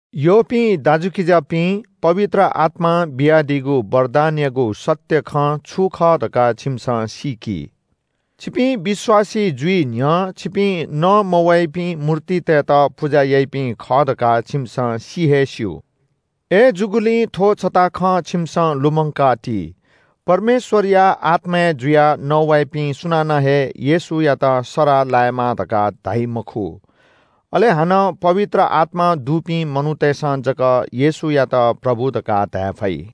यःपिं दाजुकिजापिं, पवित्र आत्‍मां बियादीगु वरदानयागु सत्‍य खँ छु खः धकाः छिमिसं सीकि। छिपिं विश्‍वासी जुइ न्‍ह्यः छिपिं नमवाइपिं मूर्तितय्‌त पुजा याइपिं खः धकाः छिमिसं सि हे स्‍यू। अय्‌जूगुलिं थ्‍व छता खँ छिमिसं लुमंका ति, परमेश्‍वरया आत्‍माय् जुयाः नवाइपिं सुनानं हे येशूयात सराः लायेमा धकाः धाइ मखु। अले हानं पवित्र आत्‍मा दुपिं मनूतय्‌सं जक येशूयात प्रभु धकाः धाये फइ।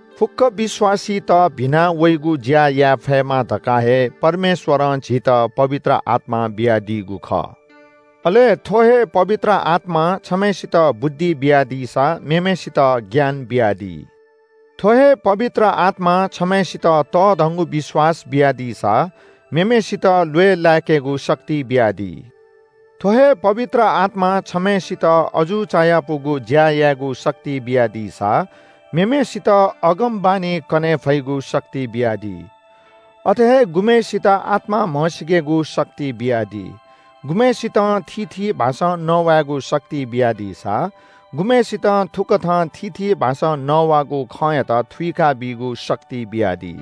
फुक्‍क विश्‍वासीत भिना वइगु ज्‍या याये फयेमा धकाः हे परमेश्‍वरं झीत पवित्र आत्‍मा बियादीगु खः। अले थ्‍व हे पवित्र आत्‍मां छम्‍हय्‌सित बुद्धि बियादीसा मेम्‍हय्‌सित ज्ञान बियादी। थ्‍व हे पवित्र आत्‍मां छम्‍हय्‌सित तःधंगु विश्‍वास बियादीसा मेम्‍हय्‌सित ल्‍वय् लाय्‌केगु वरदानत बियादी। थ्‍व हे पवित्र आत्‍मां छम्‍हय्‌सित अजू चायापुगु ज्‍या यायेगु शक्ति बियादीसा मेम्‍हय्‌सित अगमवाणी कने फइगु शक्ति बियादी। अथे हे गुम्‍हय्‌सित आत्‍मा म्‍हसीकेगु शक्ति बियादी। गुम्‍हय्‌सितं थीथी भाषां नवायेगु शक्ति बियादीसा, गुम्‍हय्‌सितं थुकथं थीथी भाषां नवाःगु खँयात थुइकाबीगु शक्ति बियादी।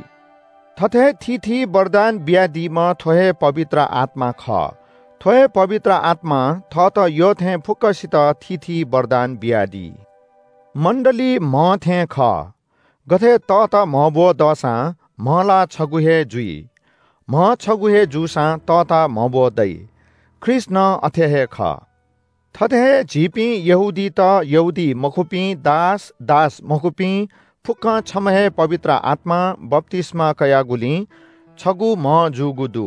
थथे थीथी वरदान बियादीम्‍ह थ्‍व हे पवित्र आत्‍मा खः। थ्‍व हे पवित्र आत्‍मां थःत यःथें फुक्‍कसित थीथी वरदान बियादी। मण्‍डली म्‍ह थें खः। गथे तःता म्‍हब्‍व दःसां म्‍ह ला छगू हे जुइ। म्‍ह छगू हे जूसां तःता म्‍हब्‍व दइ। ख्रीष्‍ट नं अथे हे खः। थथे हे झीपिं यहूदीत, यहूदीमखुपिं, दास, दासमखुपिं फुक्‍कं छम्‍ह हे पवित्र आत्‍मां बप्‍तिस्‍मा कयागुलिं छगू म्‍ह जूगु दु।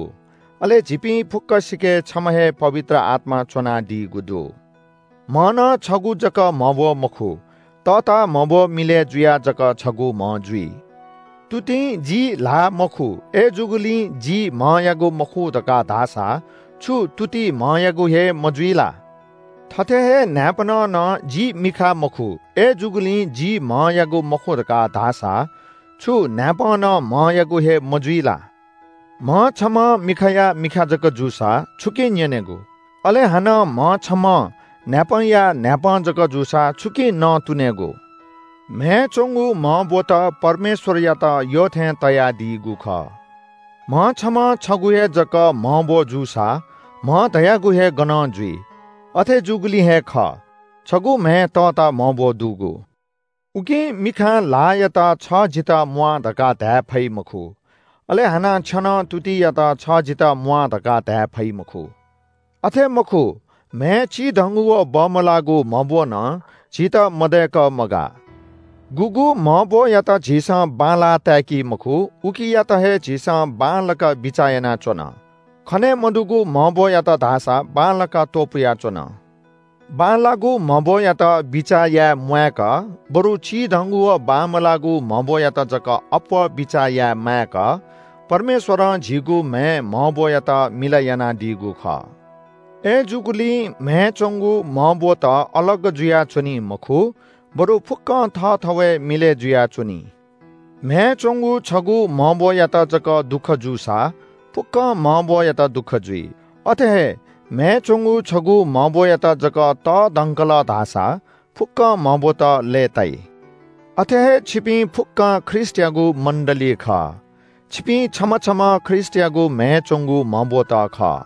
अले झीपिं फुक्‍कसिके छम्‍ह हे पवित्र आत्‍मा च्‍वनादीगु दु। म्‍ह नं छगू जक म्‍हब्‍व मखु, तःता म्‍हब्‍व मिलय् जुयाः जक छगू म्‍ह जुइ। तुतिं – “जि ल्‍हाः मखु, अय्‌जूगुलिं जि म्‍हयागु मखु” धकाः धाःसा छु तुति म्‍हयागु हे मजुइ ला? थथे हे न्‍हाय्‌पनं नं – “जि मिखा मखु, अय्‌जूगुलिं जि म्‍हयागु मखु” धकाः धाःसा छु न्‍हाय्‌पं नं म्‍हयागु हे मजुइ ला? म्‍ह छम्‍हं मिखाया मिखा जक जूसा छुकिं न्‍यनेगु? अले हानं म्‍ह छम्‍हं न्‍हाय्‌पंया न्‍हाय्‌पं जक जूसा छुकिं नँतुनेगु? म्‍हय् च्‍वंगु म्‍हब्‍वत परमेश्‍वरयात यःथें तयादीगु खः। म्‍ह छम्‍हं छगू हे जक म्‍हब्‍व जूसा म्‍ह धयागु हे गनं जुइ? अथे जूगुलिं हे खः – छगू म्‍हय् तःता म्‍हब्‍व दुगु। उकिं मिखां ल्‍हाःयात – “छ जितः म्‍वाः” धकाः धाये फइ मखु। अले हानं छेनं तुतियात – “छ जितः म्‍वाः” धकाः धाये फइ मखु। अथे मखु, म्‍हय् चिधंगु व बमलाःगु म्‍हब्‍व नं झीत मदय्‌क मगाः। गुगु म्‍हब्‍वयात झीसं बांलाः ताय्‌कि मखु उकियात हे झीसं बांलाक बिचाः यानाच्‍वन। खने मदुगु म्‍हब्‍वयात धाःसा बांलाक त्‍वपुयाच्‍वन। बांलाःगु म्‍हब्‍वयात बिचाः याये म्‍वायेक, बरु चिधंगु व बांमलाःगु म्‍हब्‍वयात जक अप्‍वः बिचाः याये माय्‌क परमेश्‍वरं झीगु म्‍हय् म्‍हब्‍वयात मिलय् यानादीगु खः। अय्‌जूगुलिं म्‍हय् च्‍वंगु म्‍हब्‍वत अलग जुयाच्‍वनी मखु, बरु फुक्‍कं थःथवय् मिलय् जुयाच्‍वनी। म्‍हय् च्‍वंगु छगू म्‍हब्‍वयात जक दुःख जूसा फुक्‍क म्‍हब्‍वयात दुःख जुइ। अथे हे म्‍हय् च्‍वंगु छगू म्‍हब्‍वयात जक तःधंकल धाःसा फुक्‍क म्‍हब्‍वत लय्‌ताइ। अथे हे छिपिं फुक्‍कं ख्रीष्‍टयागु मण्‍डली खः। छिपिं छम्‍ह छम्‍ह ख्रीष्‍टयागु म्‍हय् च्‍वंगु म्‍हब्‍वत खः।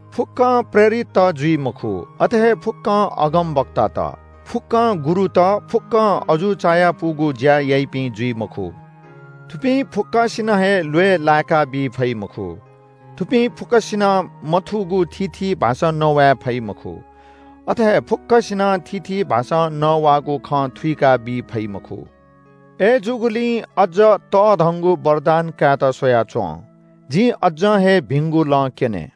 फुक्‍कं प्रेरितत जुइ मखु, अथे हे फुक्‍कं अगमवक्तात, फुक्‍कं गुरुत, फुक्‍क अजू चायापुगु ज्‍या याइपिं जुइ मखु। थुपिं फुक्‍कसिके हे ल्‍वय् लाय्‌केगु वरदान दइ मखु, थुपिं फुक्‍कसिनं मथूगु थीथी भाषां नवाये फइ मखु। अथे हे फुक्‍कसिनं थीथी भाषां नवाःगु खँ थुइकाबी फइ मखु। अय्‌जूगुलिं अज्‍ज तःधंगु वरदान कायेत स्‍वयाच्‍वँ। जिं अज्‍जं हे भिंगु लँ क्‍यने।